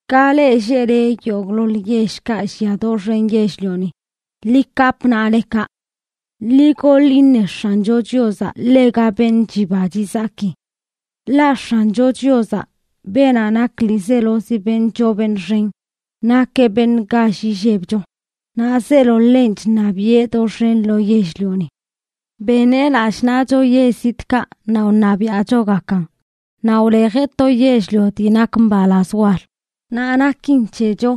Ka leꞌ lleꞌle yogꞌḻoḻ yellkaꞌ llia doxen yell-lioni, ¡ḻi kapꞌ naꞌlekaꞌ! ¡Ḻi goḻ iṉe X̱ancho Chiozaꞌ ḻega beṉꞌ chiba chizaki! Ḻaꞌ X̱ancho Chiozaꞌ, beenaꞌ nak ḻiizelozi beṉꞌ choo beṉꞌ xen, nakeꞌ beṉꞌ gall illebcho, naꞌ zeelo ḻenꞌ chṉabiꞌe doxen lo yell-lioni. Beneꞌ lallꞌ naꞌcho yell zitꞌkaꞌ naꞌ wṉabiaꞌchogakan. Naꞌ wlejeꞌ to yell-lio dii nak mbalaz wal, naꞌ nakin c̱hecho,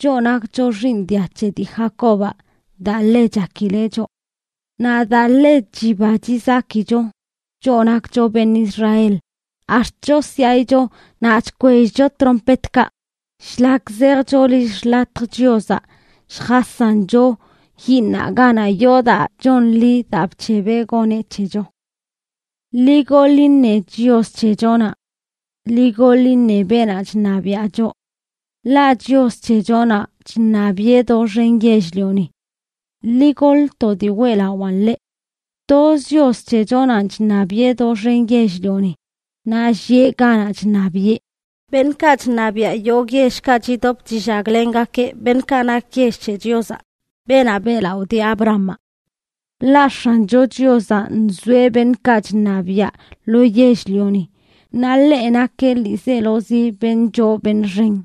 choꞌ nakcho xiiṉ dia c̱he dii Jacobaꞌ, daa ḻe chakileꞌ choꞌ. Naꞌ daa ḻe chiba chizakicho, choꞌ nakcho beṉꞌ Israel, ax̱t chosyaꞌicho naꞌ chkwellcho trompetkaꞌ shlak zejcho lill xḻatj Chiozaꞌ lljasancho yiiṉaꞌ ganaꞌ yoo daa chonḻi daa bc̱hebeꞌ goneꞌ c̱hecho. ¡Ḻi goḻ iṉe Chios c̱hechonaꞌ! ¡Ḻi goḻ iṉe beenaꞌ chṉabiaꞌ choꞌ! Ḻaꞌ Chios c̱hechonaꞌ chṉabiꞌe doxen yell-lioni. ¡Ḻi goḻ to dii weꞌlawaꞌn ḻeꞌ! Toz Chios c̱hechonanꞌ chṉabiꞌe doxen yell-lioni, naꞌ llieꞌ ganaꞌ chṉabiꞌe. Beṉꞌkaꞌ chṉabiaꞌ yogꞌ yellkaꞌ chidop chillaglengakeꞌ beṉꞌkaꞌ nak yell c̱he Chiozaꞌ, beenaꞌ beꞌlaꞌo dii Abrahamaꞌ. Ḻaꞌ X̱ancho Chiozaꞌ nzoeꞌ beṉꞌkaꞌ chṉabiaꞌ lo yell-lioni; naꞌ ḻeꞌ nakeꞌ ḻiizelozi beṉꞌ choo beṉꞌ xen.